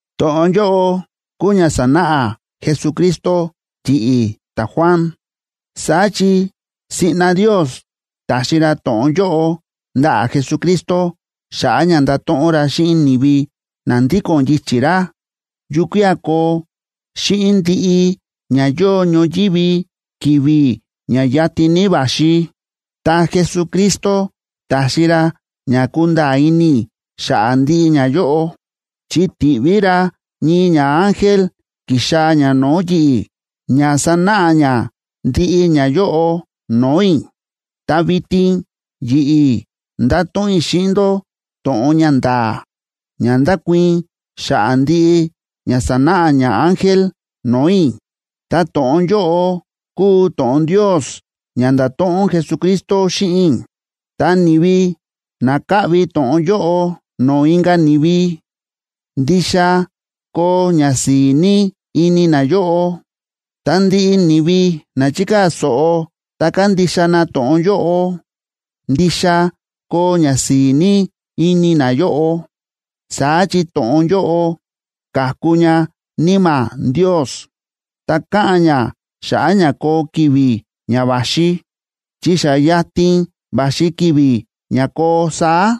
To̱ꞌon yóꞌo kúu ña sa̱náꞌa Jesucristo yi̱ꞌi̱ ta̱Juan. Saá chi siꞌna Ndios ta̱xi ra to̱ꞌon yóꞌo ndaꞌa̱ Jesucristo xa̱ꞌa̱ ña ndato̱ꞌon ra xíꞌin ni̱vi na ndíko̱n yichi̱ ra yukía̱ koo xíꞌin ndiꞌi ña yóo ñoyívi ki̱vi̱ ña yatin ní va̱xi. Ta Jesucristo ta̱xi ra ña kúnda̱a̱ ini i̱ xa̱ꞌa̱ ndiꞌi ñayóꞌo, chi ti̱ꞌví ra ñii ñaángel ki̱xaa̱ ña no̱o̱ yi̱ꞌi̱ ña sanáꞌa ña ndiꞌi ñayóꞌo no̱o̱ i̱. Ta vitin yi̱ꞌi̱ ndato̱ꞌon i̱ xíꞌin ndó to̱ꞌon ña nda̱a̱ ña ndákuii̱n xa̱ꞌa̱ ndiꞌi ña sa̱náꞌa ñaángel no̱o̱ i̱, ta to̱ꞌon yóꞌo kúu to̱ꞌon Ndios ña nda̱to̱ꞌon Jesucristo xíꞌin i̱. Ta ni̱vi na kaꞌvi to̱ꞌon yóꞌo no̱o̱ inka̱ ni̱vi, ndixa koo ñasi̱i̱ ní ini nayóꞌo. Ta ndiꞌi ni̱vi na chikaa̱ so̱ꞌo ta kandixa na to̱ꞌon yóꞌo, ndixa koo ñasi̱i̱ ní ini nayóꞌo. Saá chi to̱ꞌon yóꞌo káku ña Níma̱ Ndios, ta káꞌa̱n ña xa̱ꞌa̱ ña koo ki̱vi̱ ña va̱xi, chi xa yatin va̱xi ki̱vi̱ ña koo saá.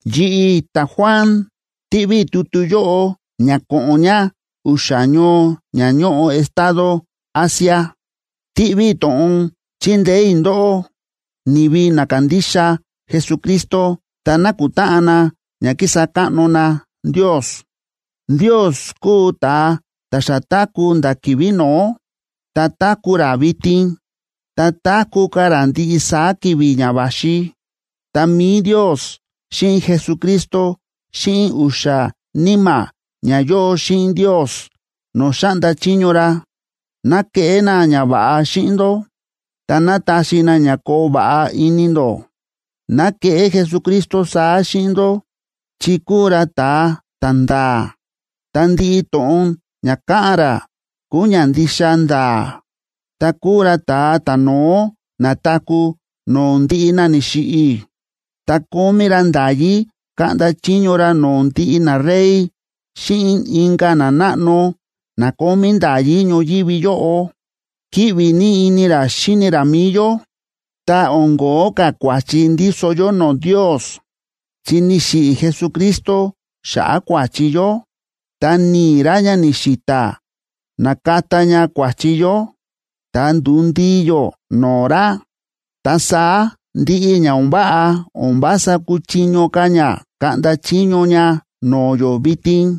Yi̱ꞌi̱, ta̱Juan, tíꞌví i̱ tutu yóꞌo ña ko̱ꞌo̱n ña u̱xa̱ ñoo ña ñóꞌo estado Asia. Tíꞌví i̱ to̱ꞌon chindeé i̱ ndóꞌó, ni̱vi na kándixa Jesucristo ta nákutáꞌan na ña kísa káꞌno na Ndios. Ndios kúu ta̱a ta̱ xa táku̱ nda̱ ki̱vi̱ no̱ó, ta táku̱ ra vitin, ta táku̱ ka̱ ra ndiꞌi saá ki̱vi̱ ña va̱xi. Ta mi̱i Ndios xíꞌin Jesucristo xíꞌin u̱xa̱ níma̱ ña yóo xíꞌin Ndios no̱o̱ xáꞌnda chiño ra, ná keꞌé na ñava̱ꞌa xíꞌin ndó, ta ná taxi na ña koo va̱ꞌa ini ndó. Ná keꞌé Jesucristo saá xíꞌin ndó chi kúu ra ta̱a ta̱nda̱a̱, ta ndiꞌi to̱ꞌon ña káꞌa̱n ra kúu ña ndixa nda̱a̱, ta kúu ra ta̱a ta̱no̱ó na̱taku̱ no̱o̱ ndiꞌi na ni̱xiꞌi̱, ta kómí ra nda̱yí kaꞌnda chiño ra no̱o̱ ndiꞌi narey xíꞌin inka̱ nanáꞌno na kómí nda̱yí ñoyívi yóꞌo. Kíꞌvi ní ini ra xíni ra mi̱i yó, ta o̱n ko̱ó ka̱ kua̱chi ndíso yó no̱o̱ Ndios, chi ni̱xiꞌi̱ Jesucristo xa̱ꞌa̱ kua̱chi yó, ta ni̱i̱ ra ña ni̱xi̱ta̱ na̱kata ña kua̱chi yó, ta ndu̱ndii yó no̱o̱ ra. Ta saá ndiꞌi ña o̱n váꞌa o̱n vása kúchiño ka̱ ña kaꞌnda chiño ña no̱o̱ yó vitin.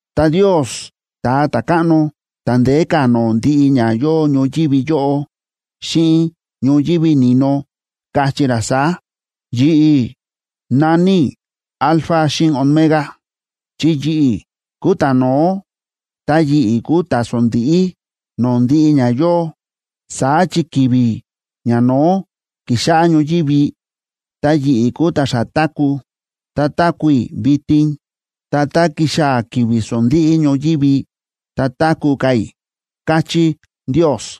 Ta Ndios, Ta̱a Ta̱káꞌno ta̱ ndeé ka̱ no̱o̱ ndiꞌi ña yóo ñoyívi yóꞌo xíꞌin ñoyívi ni̱no, káchí ra saá: “Yi̱ꞌi̱ na̱ní i̱ Alfa xíꞌin Omega,b chi yi̱ꞌi̱ kúu ta̱no̱ó ta yi̱ꞌi̱ kúu ta̱sondíꞌí no̱o̱ ndiꞌi ña yóo. Saá chi ki̱vi̱ ñano̱ó ki̱xáꞌá ñoyívi, ta yi̱ꞌi̱ kúu ta̱ xa táku̱, ta táku̱ i̱ vitin, ta tá kixaa̱ ki̱vi̱ sondíꞌí ñoyívi, ta táku̱ ka̱ i̱”, káchí Ndios.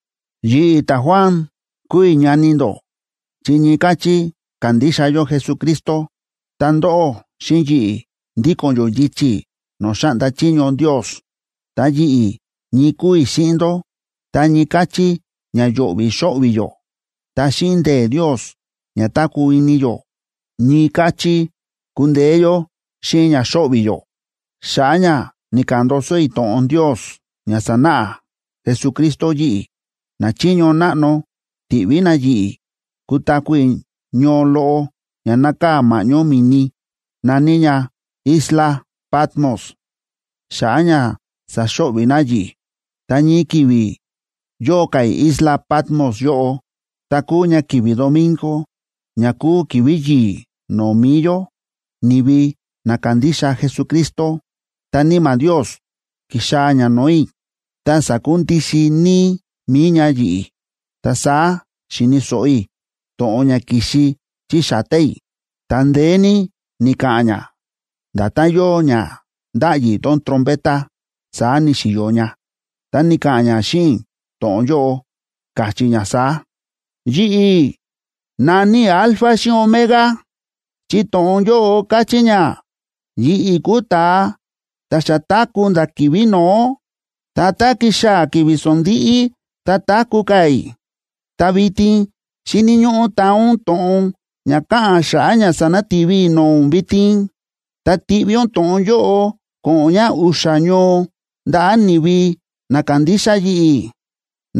Yi̱ꞌi̱, ta̱Juan, kúu i̱ ñani ndó chi ñii káchí kándixa yó Jesucristo, ta ndóꞌó xíꞌin yi̱ꞌi̱, ndíko̱n yó yichi̱ no̱o̱ xáꞌnda chiño Ndios. Ta yi̱ꞌi̱ ñii kúu i̱ xíꞌin ndó tá ñii káchí ña yo̱ꞌvi̱ xóꞌvi̱ yó. Ta xíꞌin ndee̱ Ndios ña táku̱ ini yó, ñii káchí kúndeé yó xíꞌin ña xóꞌvi̱ yó. Xa̱ꞌa̱ ña ni̱ka̱ꞌa̱n ndoso i̱ to̱ꞌon Ndios ña sa̱náꞌa Jesucristo yi̱ꞌi̱, nachiño náꞌno ti̱ꞌví na yi̱ꞌi̱ kutaku̱ i̱ ñoo loꞌo ña nákaa̱ ma̱ꞌñó mi̱ni, na̱ní ña islac Patmos xa̱ꞌa̱ ña saxo̱ꞌvi̱ na yi̱ꞌi̱. Ta ñii ki̱vi̱ yóo ka̱ i̱ isla Patmos yóꞌo, ta kúu ña ki̱vi̱ domingo, ña kúu ki̱vi̱ yi̱i̱ no̱o̱ mi̱i yó, ni̱vi na kándixa Jesucristo, ta Níma̱ Ndios ki̱xaa̱ ña no̱o̱ i̱, ta sa̱kundixin níí mi̱i ña yi̱ꞌi̱. Ta saá xi̱ni̱ so̱ꞌo i̱ to̱ꞌon ña ki̱xi chí sa̱ta̱ i̱, ta ndeé ní ni̱ka̱ꞌa̱n ña, nda̱tán yóo ña ndáꞌyi tón trompeta, saá ni̱xi̱yo ña. Ta ni̱ka̱ꞌa̱n ña xíꞌin i̱ to̱ꞌon yóꞌo, káchí ña saá: ―Yi̱ꞌi̱ na̱ní i̱ Alfa xíꞌin Omega, chi to̱ꞌon yóꞌo káchí ña yi̱ꞌi̱ kúu ta̱a ta̱ xa táku̱ nda̱ ki̱vi̱ no̱ó, ta tá kixaa̱ ki̱vi̱ sondíꞌí, ta táku̱ ka̱ i̱. Ta vitin xíni̱ ñóꞌó taa ún to̱ꞌon ña káꞌa̱n xa̱ꞌa̱ ña sanati̱vi i̱ no̱o̱ ún vitin, ta tiꞌví ún to̱ꞌon yóꞌo ko̱ꞌo̱n ña u̱xa̱ ñoo ndaꞌa̱ ni̱vi na kándixa yi̱ꞌi̱,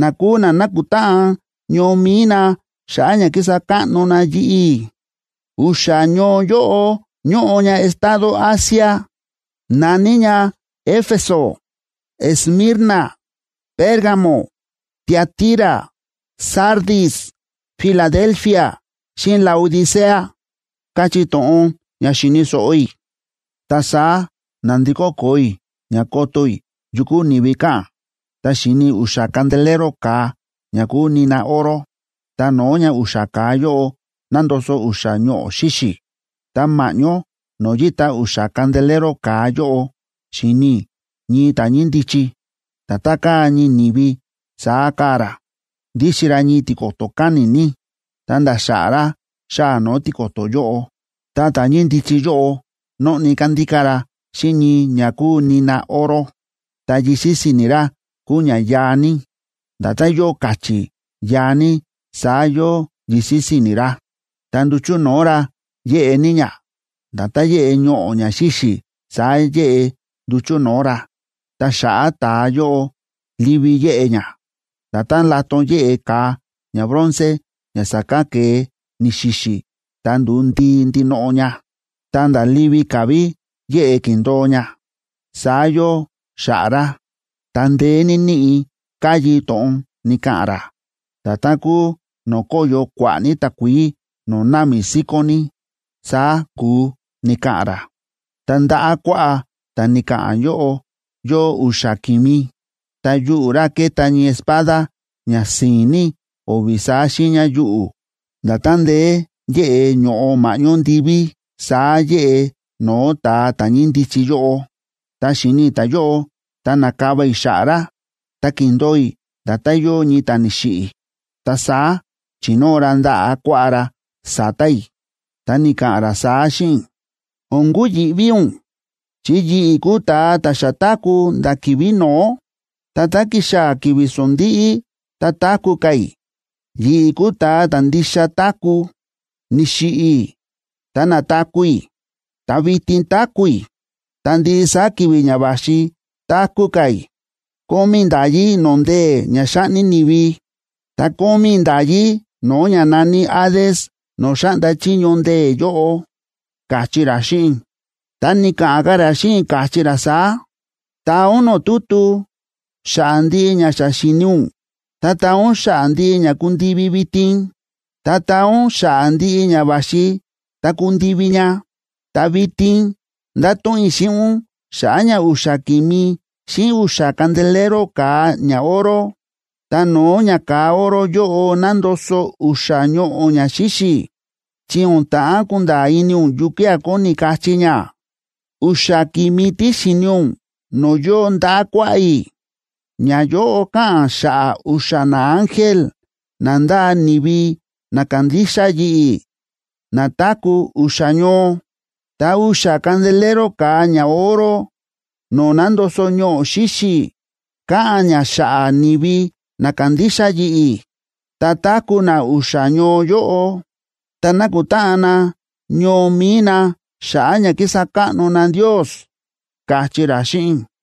na kúu na nákutáꞌan ñoo mi̱i na xa̱ꞌa̱ ña kísa káꞌno na yi̱ꞌi̱. U̱xa̱ ñoo yóꞌo ñóꞌo ña estado Asia, na̱ní ña Éfeso, Esmirna, Pérgamo, Tiatira, Sardis, Filadelfia, xíꞌin Laodicea ―káchí to̱ꞌon ña xi̱ni̱ so̱ꞌo i̱. Ta saá na̱ndikó koo i̱ ña koto i̱ yu kúu ni̱vi káꞌa̱n, ta xi̱ni i̱ u̱xa̱ candelero ka̱a ña kúu nina oro. Ta no̱o̱ ña u̱xa̱ ka̱a yóꞌo nándoso u̱xa̱ ñoꞌo̱ xíxi̱. Ta ma̱ꞌñó no̱o̱ yíta u̱xa̱ candelero ka̱a yóꞌo, xi̱ni i̱ ñii ta̱ ñíndichi, nda̱tán káa ñii ni̱vi saá káa ra. Ndíxin ra ñii tiko̱to̱ káni̱ ní, ta̱nda̱ xa̱ꞌa̱ ra xáa̱ no̱o̱ tiko̱to̱ yóꞌo. Ta ta̱ ñíndichi yóꞌo nóꞌni kándíká ra xíꞌin ñii ña kúu nina oro. Ta yisi̱ si̱ni̱ ra kúu ña yaa ní. Nda̱tán yóo ka̱chi̱ yaa ní saá yóo yisi̱ si̱ni̱ ra. Ta nduchu̱ no̱o̱ ra yéꞌe ní ña: nda̱tán yéꞌe ñoꞌo̱ ña xíxi̱ saá yéꞌe nduchu̱ no̱o̱ ra. Ta xa̱ꞌa̱ ta̱a yóꞌo livi yéꞌe ña, nda̱tán laton yéꞌe ka̱a ñabronce ña sa̱kán ke̱e ni̱xi̱xi̱ ta ndu̱u ndii ndinoꞌo ña, ta̱nda̱ livi ka̱ ví yéꞌe kíndo̱o ña, saá yóo xa̱ꞌa̱ ra. Ta ndeé ní níꞌi̱ káyi to̱ꞌon ni̱ka̱ꞌa̱n ra, nda̱tán kúu no̱o̱ kóyo kua̱ꞌa̱ ní takuií no̱o̱ námi síkón ní, saá ku̱u ni̱ka̱ꞌa̱n ra. Ta ndaꞌa̱ kuaꞌá ta̱ ni̱ka̱ꞌa̱n yóꞌo, yóo u̱xa̱ ki̱mi, ta yuꞌu̱ ra ke̱ta ñii espada ña si̱i̱n ní o̱vi̱ saá xiiña yuꞌu̱. Nda̱tán ndeé yéꞌe ño̱ꞌo ma̱ꞌñó ndiví saá yéꞌe no̱o̱ ta̱a ta̱ ñíndichi yóꞌo. Tá xi̱ni i̱ ta̱yóꞌo, ta na̱kava i̱ xa̱ꞌa̱ ra, ta ki̱ndo̱o i̱ nda̱tán yóo ñii ta̱ ni̱xiꞌi̱. Ta saá chi̱nóo ra ndaꞌa̱ kuaꞌá ra sa̱ta̱ i̱, ta ni̱ka̱ꞌa̱n ra saá xíꞌin i̱: ―O̱n kuyi̱ꞌví ún, chi yi̱ꞌi̱ kúu ta̱a ta̱ xa táku̱ nda̱ ki̱vi̱ no̱ó, ta tá kixaa̱ ki̱vi̱ sondíꞌí, ta táku̱ ka̱ i̱. Yi̱ꞌi̱ kúu ta̱a ta̱ ndixa táku̱. Ni̱xiꞌi̱ i̱, ta na̱taku̱ i̱, ta vitin táku̱ i̱, ta ndiꞌi saá ki̱vi̱ ña va̱xi táku̱ ka̱ i̱. Kómí i̱ nda̱yí no̱o̱ ndee̱ ña xáꞌni ni̱vi, ta kómí i̱ nda̱yí no̱o̱ ña na̱ní Hades no̱o̱ xáꞌnda chiño ndee̱ yóꞌo ―káchí ra xíꞌin i̱. Ta ni̱ka̱ꞌa̱n ka̱ ra xíꞌin i̱, káchí ra saá: ―Taa ún no̱o̱ tutu xa̱ꞌa̱ ndiꞌi ña xa xi̱ni ún, ta taa ún xa̱ꞌa̱ ndiꞌi ña kúndivi vitin, ta taa ún xa̱ꞌa̱ ndiꞌi ña va̱xi ta kundivi ña. Ta vitin ndato̱ꞌon i̱ xíꞌin ún xa̱ꞌa̱ ña u̱xa̱ ki̱mi xíꞌin u̱xa̱ candelero ka̱a ñaoro, ta no̱o̱ ña ka̱a oro yóꞌo nándoso u̱xa̱ ñoꞌo̱ ña xíxi̱, chi o̱n ta̱ꞌán kunda̱a̱ ini ún yukía̱ kóni kachí ña. U̱xa̱ ki̱mi tí xi̱ni ún no̱o̱ yóo ndaꞌa̱ kuaꞌá i̱, ñayóꞌo káꞌa̱n xa̱ꞌa̱ u̱xa̱ naángel na ndáa ni̱vi na kándixa yi̱ꞌi̱ na táku̱ u̱xa̱ ñoo. Ta u̱xa̱ candelero ka̱a ñaoro no̱o̱ nándoso ñoꞌo̱ xíxi̱ káꞌa̱n ña xa̱ꞌa̱ ni̱vi na kándixa yi̱ꞌi̱, ta táku̱ na u̱xa̱ ñoo yóꞌo, ta nákutáꞌan na ñoo mi̱i na xa̱ꞌa̱ ña kísa káꞌno na Ndios ―káchí ra xíꞌin i̱.